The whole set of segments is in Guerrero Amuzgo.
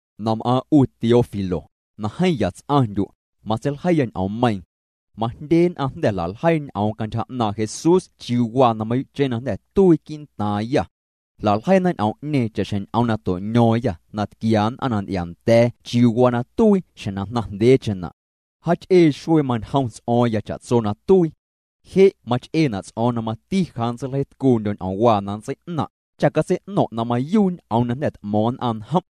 Na m'aaⁿ' 'u Teófilo, na jeeⁿ ya ts'aⁿndyu', matseiljeiya ñ'oommeiiⁿ. Majndye nn'aⁿ jnda̱ jla'ljeii ñ'oom cantyja 'naaⁿ' Jesús chiuu waa na mayuu'cheⁿ na jnda̱ tuii quii'ntaaⁿyâ. Jla'ljeiina ñ'oom'ñeeⁿ cha'xjeⁿ ñ'oom na to'ño̱o̱ⁿyâ na tquia nn'aⁿ na nty'iaanda̱a̱ chiuu waa na tuii xjeⁿ na jnaⁿcheⁿna'. Jaach'ee xuee mañjom ts'o̱o̱ⁿya cha'tso na tuii. Je' mach'eena' ts'o̱o̱ⁿ na mati ja nntseiljeitcuundyo̱ ñ'oomwaa na nntsei'naⁿ', cha catsei'no̱ⁿ' na mayuu' ñ'oom na jnda̱ t'mo̱o̱ⁿ nn'aⁿ njom'.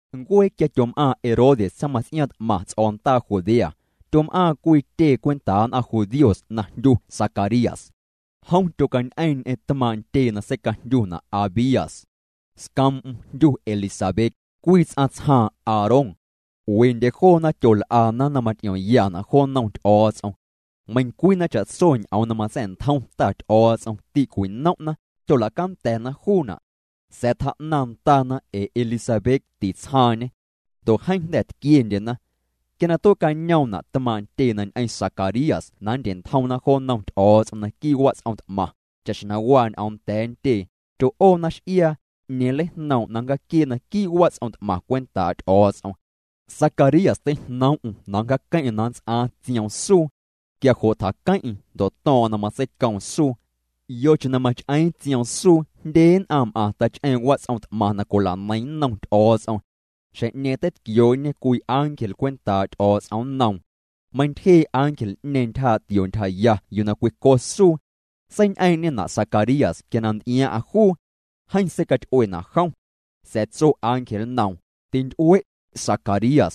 Ncuee quia tyom'aaⁿ Herodes tsaⁿmaⁿts'iaaⁿ t'maⁿ ts'o̱ndaa Judea, tyom'aaⁿ cwii tyee cwentaa nn'aⁿ judíos na jndyu Zacarías. Jom tyocañ'eeⁿ ñ'eⁿ tmaaⁿ' ntyee na seicajndyuna' Abías. Scoom'm jndyu Elisabet, cwii ts'aⁿ tsjaaⁿ Aarón. Wendye joona, tyol'ana na maty'iomyana' jo nnom Ty'o̱o̱ts'om. Meiⁿcwii na cha'tso ñ'oom na matsa̱'ntjom Ta Ty'o̱o̱ts'om tîcwi'nom'na, tyola'canda̱na juuna'. Sa̱a̱ tjaa'naⁿ ndana ee Elisabet tîc'oom jnaaⁿ. Ndo' jeeⁿ jnda̱ tquiendyena. Quia na tue'cañoomna' tmaaⁿ' ntyee na ñ'eⁿ Zacarías na nndye'ntjomna jo nnom Ty'o̱o̱ts'om naquii' wats'om t'maⁿ, cha'xjeⁿ na waa ñ'oom nda̱a̱ ntyee, tyo'oona x'iaa, 'ñeeⁿ nleijnoom' na nncjaaquiee' naquii' wats'om t'maⁿ cwentaa' Ty'o̱o̱ts'om. Zacarías teijnoom'm na nncjaaqueⁿ'eⁿ na nnts'aaⁿ tsioom suu. Quia jo' tjaqueⁿ'eⁿ ndo' to̱o̱ⁿ'o̱ⁿ na matseicoom suu. Yocheⁿ na mach'eeⁿ tsioom suu jndye nn'aⁿ m'aⁿ tach'eeⁿ' wats'om t'maⁿ na cwila'neiⁿ nnom Ty'o̱o̱ts'om. Xjeⁿ'ñeeⁿ teitquioo'ñe cwii ángel cwentaa' Ty'o̱o̱ts'om nnoom. Meintyjee' ángel'ñeeⁿ ntyjaa' tio ntyjaya yuu na cwico suu. Seiñ'eeⁿ'na' Zacarías quia na nty'iaaⁿ'aⁿ juu. Jeeⁿ seicaty'uena' jom. Sa̱a̱ tso ángel nnoom: —Tinty'ue', Zacarías.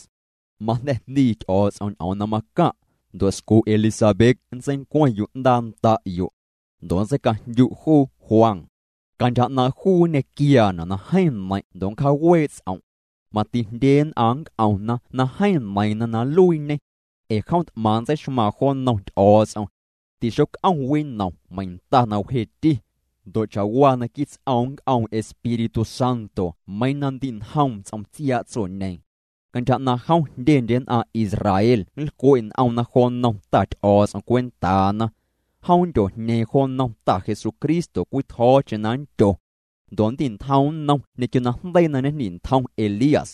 Majnda̱ jndii Ty'o̱o̱ts'om ñ'oom na macaⁿ'. Ndo' scu' Elisabet nntseincueⁿ yu'ndaa nda'yo'. Ndo' nntseicajndyu' juu Juan. Cantyja 'naaⁿ' juu nñequiaana' na jeeⁿ neiⁿ' ndo' nncjaawee' ts'om'. Mati jndye nn'aⁿ nnc'omna na jeeⁿ neiiⁿna na nluiiñê. Ee jom t'maⁿ nntseixmaaⁿ jo nnom Ty'o̱o̱ts'om. Tixoc'om winom meiⁿ nta na wjeeti. Ndo' cha'waa naquii' ts'oom nnc'oom Espíritu Santo meiiⁿ na ndi njoom ts'om tsiaa' tsoñeeⁿ. Cantyja 'naaⁿ' jom jndyendye nn'aⁿ tsjaaⁿ Israel nlcwe' n'omna jo nnom Ta Ty'o̱o̱ts'om cwentaana. Jom nndyojñeeⁿ jo nnom Ta Jesucristo cwii tjo̱o̱cheⁿ na nndyo. Ndo' nndi'ntjoom nnom ñequio najndeii na ñejndi'ntjom Elías.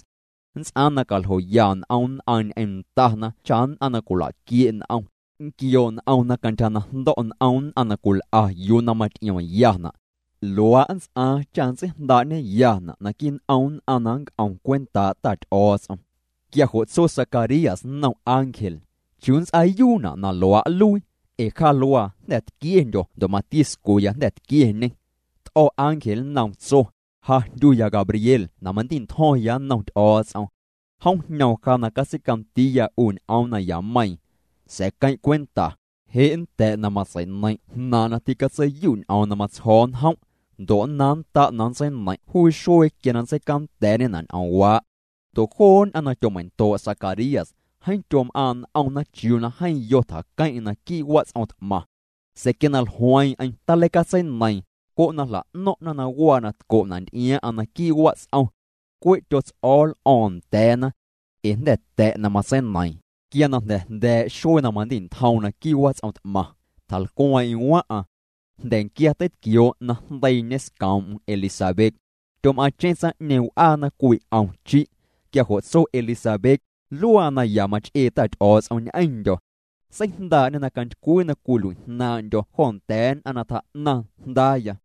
Nnts'aaⁿ na caljoya n'om nn'aⁿ ñ'eⁿ ndana cha nn'aⁿ na cwila'quie' n'om, nnquioo' n'omna cantyja na jndo̱' n'om nn'aⁿ na cwil'a yuu na maty'iomyana'. Luaa' nnts'aaⁿ cha nntseijndaa'ñeyana' naquii' n'om nn'aⁿ na nnc'om cwentaa' Ta Ty'o̱o̱ts'om. Quia jo' tso Zacarías nnom ángel: —¿Chiuu nnts'aayuuna' na luaa' nluii? Ee ja luaa jnda̱ tquiendyo̱ ndo' mati scuya jnda̱ tquieñê. T'o̱ ángel nnoom, tso: —Ja jndyuya Gabriel na mandi'ntjo̱ⁿya nnom Ty'o̱o̱ts'om. Jom jñoom ja na catseicandiiya 'u ñ'oom nayameiiⁿ. Sa̱a̱ queⁿ' cwenta, je' nnta̱' na matsei'neiⁿ' jnaaⁿ' na ticatseiyu' ñ'oom na matsjo̱o̱ njom'. Ndo' nnaaⁿnnda' na nntseineiⁿ' juu xuee quia na nntseicanda̱a̱'ñena' ñ'oomwaa'. Ndo' joo nn'aⁿ na tyomeindoo' Zacarías, jeeⁿ tyom'aaⁿ' n'omna chiuu waa na jeeⁿ yo tjaqueⁿ'eⁿ naquii' wats'om t'maⁿ. Sa̱a̱ quia na jlueeⁿ'eⁿ taleicatseineiiⁿ, jo' na jla'no̱ⁿ'na na waa na tco'na' nty'iaaⁿ'aⁿ naquii' wats'om. Cwe' tyots'o̱o̱ l'o̱o̱ⁿ nda̱a̱na. Ee jnda̱ ta̱' na matseineiiⁿ. Quia na jnda̱ jnda̱a̱' xuee na mandi'ntjoom naquii' wats'om t'maⁿ, tjalcweeⁿ'eⁿ waⁿ'aⁿ. Jnda̱nquia teitquioo' na jndeiiñe scoom'm Elisabet. Tyom'aaⁿcheⁿ tsaⁿ'ñeeⁿ w'aana cwii 'om chi'. Quia jo' tso juu Elisabet: “Luaa naya mach'ee Ta Ty'o̱o̱ts'om ñ'eⁿndyo̱. Seijndaa'ñê na cantycwii na cwicalui'jnaaⁿ'ndyo̱ jo nda̱a̱ nn'aⁿ na tjaa'naⁿ jndaaya.”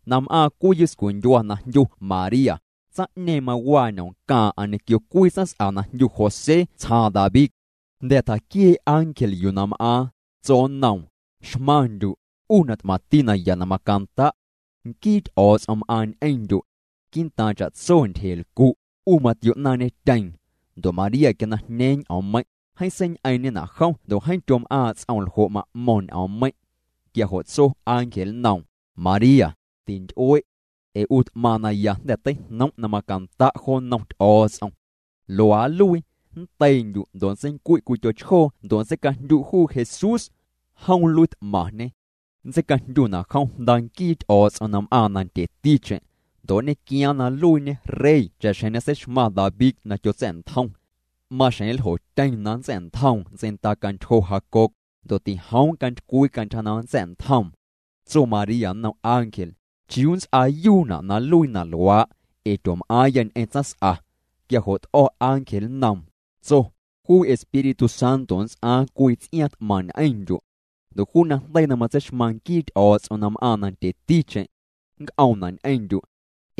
na m'aaⁿ cwii yuscundyua na jndyu María, tsaⁿ'ñeeⁿ mawaa ñomcaaⁿ'aⁿ ñequio cwii tsaⁿs'a na jndyu José tsjaaⁿ David. Jnda̱ tjaquiee' ángel yuu na m'aaⁿ, tso nnoom: —Xmaⁿndyu', 'u na t'maⁿti naya na macanda'. Nquii Ty'o̱o̱ts'om m'aaⁿñê ñ'eⁿndyu'. Quii'ntaaⁿ cha'tso ntyjelcu', 'u matio'naaⁿñetyeeⁿ. Ndo' María quia na jñeeⁿ ñ'oommeiⁿ', jeeⁿ seiñ'eeⁿ'ñena' jom ndo' jeeⁿ tyom'aaⁿ' ts'oom ljo' ma'mo̱ⁿ ñ'oommeiⁿ'. Quia jo' tso ángel nnoom: —María, tinty'ue'. Ee 'u t'maⁿ naya jnda̱ teijnom' na macanda' jo nnom Ty'o̱o̱ts'om. Luaa nluii, nndeiindyu' ndo' nntseincui' cwii tyochjoo ndo' nntseicajndyu' juu Jesús. Jom nluiit'maⁿñê. Nntseicajndyuna' jom Jnda nquii Ty'o̱o̱ts'om na m'aaⁿ nandyeticheⁿ. Ndo' nñequiaaⁿ na nluiiñe rey cha'xjeⁿ ñeseixmaⁿ David na tyotsa̱'ntjom. Maxjeⁿ nljotyeⁿ na nntsa̱'ntjoom ntseindacantyjo Jacob, ndo' tijoom cantycwii cantyja na nntsa̱'ntjoom. Tso María nnom ángel: —¿Chiuu nnts'aayuuna' na nluii na luaa'? Ee tyoom'aaⁿya ñ'eⁿ tsaⁿs'a. Quia jo' t'o̱ ángel nnoom, tso: —Juu Espíritu Santo nnts'aaⁿ cwii ts'iaaⁿ t'maⁿ ñ'eⁿndyu'. Ndo' juu na jndeii na matseixmaⁿ nquii Ty'o̱o̱ts'om na m'aaⁿ nandyeticheⁿ, nnc'oomna' ñ'eⁿndyu'.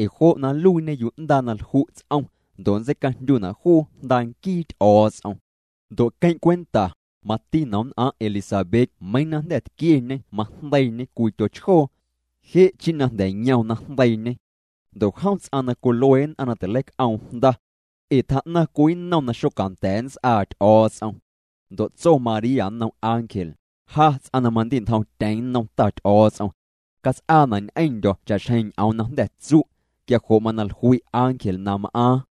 Ee jo' na nluiiñe yu'ndaa na lju' ts'om, ndo' nntseicajndyuna' juu Jnda nquii Ty'o̱o̱ts'om. Ndo' queⁿ' cwenta, mati nomnn'aⁿ' Elisabet meiiⁿ na jnda̱ tquieñê majndeiiñê cwii tyochjoo. Je' chi' na jnda̱ yom na jndeiiñê. Ndo' jom ts'aⁿ na cwilue nn'aⁿ na tileic'oom jnda. Ee tjaa'naⁿ cwii nnom na xocanda̱a̱ nnts'aa Ty'o̱o̱ts'om. Ndo' tso María nnom ángel: —Ja ts'aⁿ mandi'ntjomtyeⁿ nnom Ta Ty'o̱o̱ts'om. Cats'aana' ñ'eⁿndyo̱ cha'xjeⁿ ñ'oom na jnda̱ tsu'. Quia jo' mana jlui' ángel na m'aaⁿ.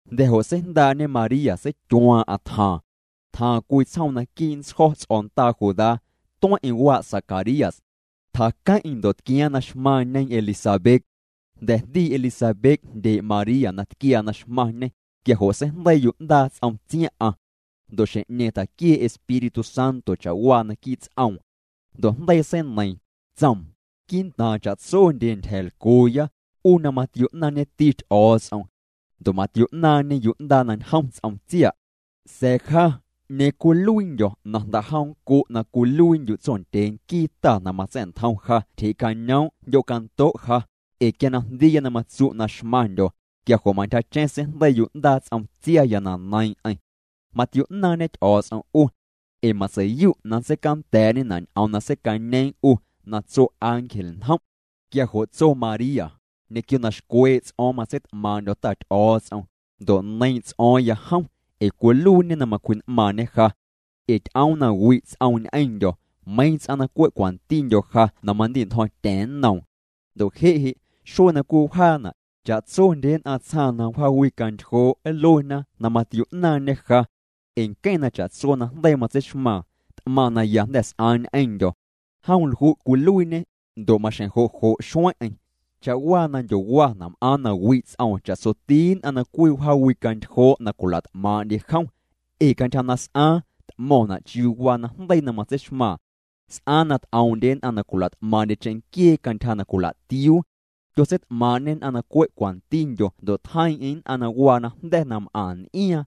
Jnda̱ jo' seijndaa'ñe María, seityuaaⁿ'aⁿ tjaaⁿ. Tjaaⁿ cwii tsjoom naquii' ntsjo̱ ts'o̱ndaa Judá. Tueⁿ'eⁿ waa' Zacarías. Tjaqueⁿ'eⁿ ndo' tquiaaⁿ na xmaⁿñe Elisabet. Jnda̱ na jndii Elisabet jndyee' María na tquiaa na xmaⁿñê, quia jo' seijndeii yu'ndaa ts'om tsiaⁿ'aⁿ. Ndo' xjeⁿ'ñeeⁿ tjaquiee' Espíritu Santo cha'waa naquii' ts'oom. Ndo' jndeii seineiiⁿ, tsoom: —Quii'ntaaⁿ cha'tsondye tyja̱a̱lcuuya, 'u na matio'naaⁿñeti Ty'o̱o̱ts'om. Ndo' matio'naaⁿñê yu'ndaa na njom ts'om tsia'. Sa̱a̱ ja, ¿'ñeeⁿ cwiluiindyo̱ na jnda'jom nncu' na cwiluiindyu' tsondyee quii Ta na matsa̱'ntjom ja tyjee'cañoom' jndyocando' ja? Ee quia na jndiiya na matsu' na xmaⁿndyo̱, quia jo' mantyjacheⁿ seijndeii yu'ndaa ts'om tsiaya na neiiⁿ'eⁿ. Matio'naaⁿñe Ty'o̱o̱ts'om 'u. Ee matsei'yu' na nntseicanda̱a̱'ñena' ñ'oom na seicañeeⁿ 'u, na tso ángel njom'. Quia jo' tso María: Ñequio na xcwee' ts'o̱o̱ⁿ matseit'maaⁿ'ndyo̱ Ta Ty'o̱o̱ts'om, ndo' neiiⁿ' ts'o̱o̱ⁿya jom, ee cwiluiiñê na macwji'n'maaⁿñê ja. Ee ty'oom na wi' ts'oom ñ'eⁿndyo̱, meiiⁿ ts'aⁿ na cwe' cwantindyo ja na mandi'ntjo̱ⁿtya̱ⁿ nnoom. Ndo' je' je', xuee na cwii wjaana', cha'tsondye nn'aⁿ tsjaaⁿ na wjaawicantyjoo' nluena na matio'naaⁿñê ja. Ee nqueⁿ na cha'tso najndeii matseixmaaⁿ, t'maⁿ naya jnda̱ s'aaⁿ ñ'eⁿndyo̱. Jom lju' cwiluiiñê, ndo' maxjeⁿ jo' jo' xueⁿ'eⁿ. Cha'waa na ndyowana', m'aaⁿ na wi' ts'oom cha'tsoti nn'aⁿ na cwii wjaawicantyjoo' na cwila't'maaⁿ'ndye jom. Ee cantyja na s'aaⁿ, t'mo̱ⁿna' chiuu waa najndeii na matseixmaaⁿ. S'aaⁿ na t'oom'ndye nn'aⁿ na cwila't'maaⁿ'ndye cheⁿnquiee cantyja na cwila'tiuu. Tyotseit'maaⁿ'ñê nn'aⁿ na cwe' cwantindyo ndo' tjeiiⁿ'eⁿ nn'aⁿ na waa najnda̱ na m'aⁿ n'iaaⁿ.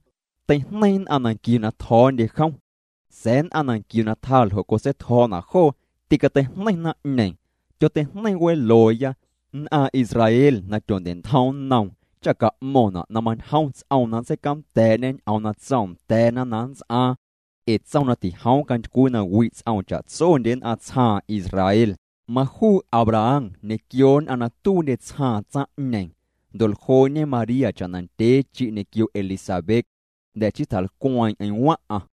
Teijneiⁿ nn'aⁿ na nquiu na tjo̱o̱ndye jom. Sa̱a̱ nn'aⁿ na nquiu na tjaa ljo' cotseitjo̱o̱na' joo, tîcateijneiⁿ naⁿ'ñeeⁿ. Tyoteijneiⁿ welooya, nn'aⁿ Israel na tyondye'ntjom nnoom, cha ca'mo̱ⁿna' na mañjom ts'oom na nntseicanda̱a̱'ñê ñ'oom na tsoom nda̱a̱na na nnts'aaⁿ. Ee tsoom na tijoom cantycwii na wi' ts'oom cha'tsondye nn'aⁿ tsjaaⁿ Israel, majuu Abraham ñequio nn'aⁿ na tuiindye tsjaaⁿ tsaⁿ'ñeeⁿ. Ndo' ljoo'ñe María cha'na ndyee chi' ñequio Elisabet. Jnda̱ chii tjalcweeⁿ'eⁿ waⁿ'aⁿ.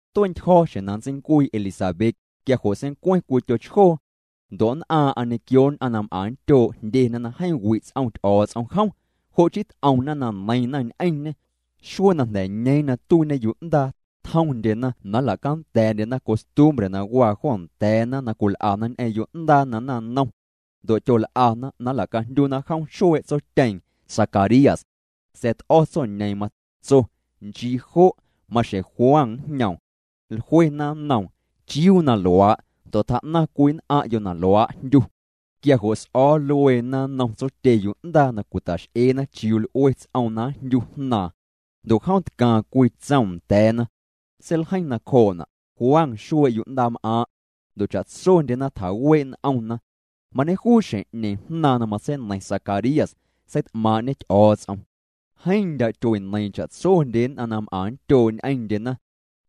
Tue'ntyjo̱ xjeⁿ na nntseincuii Elisabet, quia jo' seincueⁿ cwii tyochjoo. Ndo' nn'aaⁿ'aⁿ ñequio nn'aⁿ na m'aⁿ nndyoo' jndyena na jeeⁿ wi' ts'om Ty'o̱o̱ts'om jom. Jo' chii t'omna na neiiⁿna ñ'eⁿñê. Xuee na jnda̱ ñeeⁿ na tuiiñe yu'ndaa, tjomndyena na nla'canda̱a̱'ndyena costumbre na waa jo nda̱a̱na na cwil'ana ñ'eⁿ yo'ndaa na naⁿnom. Ndo' tyol'ana na nla'cajndyuna jom xuee' tsotyeeⁿ, Zacarías. Sa̱a̱ t'o̱ tsoñeeⁿ, matso: —Nchii jo', maxjeⁿ Juan njñoom. Jluena nnoom: —¿Chiuu na luaa'? ndo' tjaa'naⁿ cwii nn'aⁿ'yo' na luaa' jndyu. Quia jo' s'o̱o̱ lueena nnom tsotye yu'ndaa na cwitax'eena chiuu l'ue ts'oom na njndyu jnaaⁿ. Ndo' jom tcaaⁿ cwii tsom nda̱a̱na. Seiljeiⁿ nacjoo'na': “Juan xuee' yu'ndaam'aaⁿ'.” Ndo' cha'tsondyena tjawee' n'omna. Mañejuu xjeⁿ'ñeeⁿ, jnaaⁿ na matseineiⁿ Zacarías, seit'maaⁿ'ñê Ty'o̱o̱ts'om. Jeeⁿ ndyaa' tyueneiiⁿ cha'tsondye nn'aⁿ na m'aⁿ nndyoo' ñ'eⁿndyena.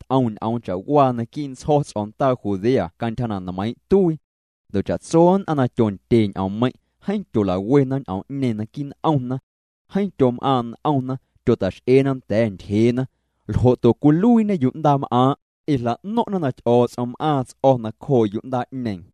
T'om ñ'oom cha'waa naquii' ntsjo̱ ts'o̱ndaa Judea cantyja na nmeiiⁿ' tuii. Ndo' cha'tso nn'aⁿ na tyondye ñ'oommeiⁿ', jeeⁿ tyola'wena ñ'oom'ñeeⁿ naquii' n'omna. Jeeⁿ tyom'aaⁿ' n'omna, tyota'x'eena nda̱a̱ ntyjeena: —¿Ljo'to cwiluiiñe yu'ndaam'aaⁿ'? Ee jla'no̱ⁿ'na na Ty'o̱o̱ts'om m'aaⁿ ts'o̱ nacjoo' yu'ndaa'ñeeⁿ.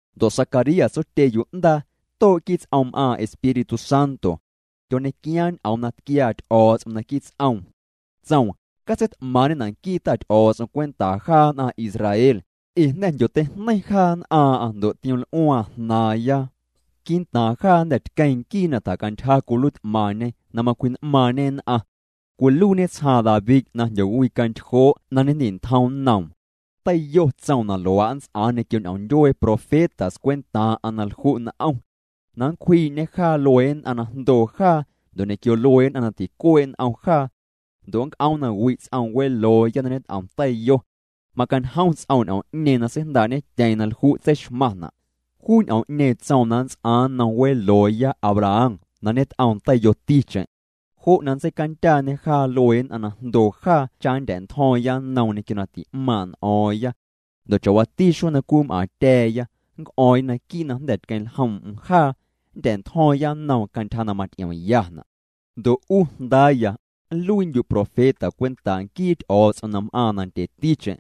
Ndo' Zacarías, tsotye yu'ndaa, too' quii' ts'oom m'aaⁿ Espíritu Santo. Tyoñequiaaⁿ ñ'oom na tquiaa Ty'o̱o̱ts'om naquii' ts'oom. Tsoom: Catseit'maaⁿ'ñena' nquii Ta Ty'o̱o̱ts'om cwentaa jaa nn'aⁿ Israel, ee jnda̱ jndyoteijneiⁿ jaa nn'aaⁿ'aⁿ ndo' tioml'uaaⁿ jnaaⁿya. Quii'ntaaⁿ jaa jnda̱ tqueeⁿ nquii na tjacantyja cwiluiit'maⁿñe na macwji'n'maaⁿñe nn'aⁿ. Cwiluiiñe tsjaaⁿ David na jndyowicantyjoo' na ñejndi'ntjom nnoom. Teiyo tsoom na luaa' nnts'aaⁿ ñequio ñ'oom ndyuee profetas cwentaaⁿ'aⁿ na lju' n'om. Na nncwjii'ñê jaa luee nn'aⁿ na jndoo jaa, ndo' ñequio luee nn'aⁿ na ticuee' n'om jaa. Ndo' nnc'oom na wi' ts'oom welooya na ñet'om teiyo. Macañjom ts'oom ñ'oom'ñeeⁿ na seijndaa'ñetyeeⁿ na lju' tseixmaⁿna'. Juu ñ'oom'ñeeⁿ tsoom na nnts'aaⁿ nnom welooya Abraham na ñet'oom teiyoticheⁿ. Jo' na nntseicandyaañê jaa luee nn'aⁿ na jndoo jaa cha nndya̱'ntjo̱o̱ⁿya nnoom ñequio na ti'maaⁿ' n'o̱o̱ⁿya. Ndo' cha'waati xuee na cwii m'aaⁿtya̱a̱ya, nnc'o̱o̱ⁿya naquii' na jnda̱ tqueⁿljoom'm jaa. Nndya̱'ntjo̱o̱ⁿya nnoom cantyja na maty'iomyana'. Ndo' 'u jndaaya, nluiindyu' profeta cwentaa' nquii Ty'o̱o̱ts'om na m'aaⁿ nandyeticheⁿ.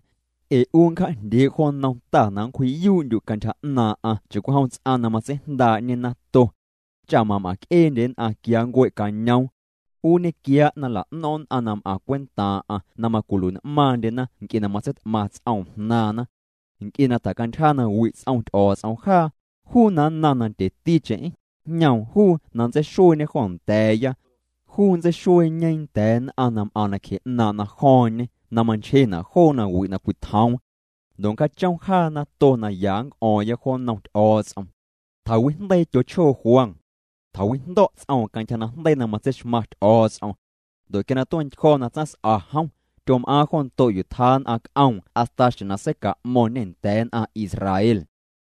Ee 'u nncja'jndyee' jo nnom Ta na nncwji'yuu'ndyu' cantyja 'naaⁿ'aⁿ cha'cwijom ts'aⁿ na matseijndaa'ñe nato, cha mam'aⁿc'eendye nn'aⁿ quia nncuee'cañoom. 'U nñequiaa' na nla'no̱ⁿ' nn'aⁿ na m'aⁿ cwentaaⁿ'aⁿ na macwilui'n'maaⁿndyena nc'e na matseit'maⁿ ts'oom jnaaⁿna. Nc'e na tjacantyja na wi' ts'om Ty'o̱o̱ts'om jaa, juu na nnaⁿ nandyeticheⁿ, njñoom juu na nntseixueeñe jo nda̱a̱ya. Juu nntseixueeñe nda̱a̱ nn'aⁿ na m'aⁿ nacje 'naaⁿ' najo̱o̱ⁿñe na manchjena' joo na wi' na cwitjoom. Ndo' nncjaachom jaa nato na ya nnc'o̱o̱ⁿya jo nnom Ty'o̱o̱ts'om. Tjawijndeii tyochjoo Juan. Tjawijndo̱' ts'oom cantyja najndeii na matseixmaⁿ Ty'o̱o̱ts'om. Ndo' quia na tue'ntyjo̱ na tsaⁿs'a jom, tyom'aaⁿ jo ndo' yuu tjaa nn'aⁿ c'oom hasta xjeⁿ na seica'mo̱ⁿñê nda̱a̱ nn'aⁿ Israel.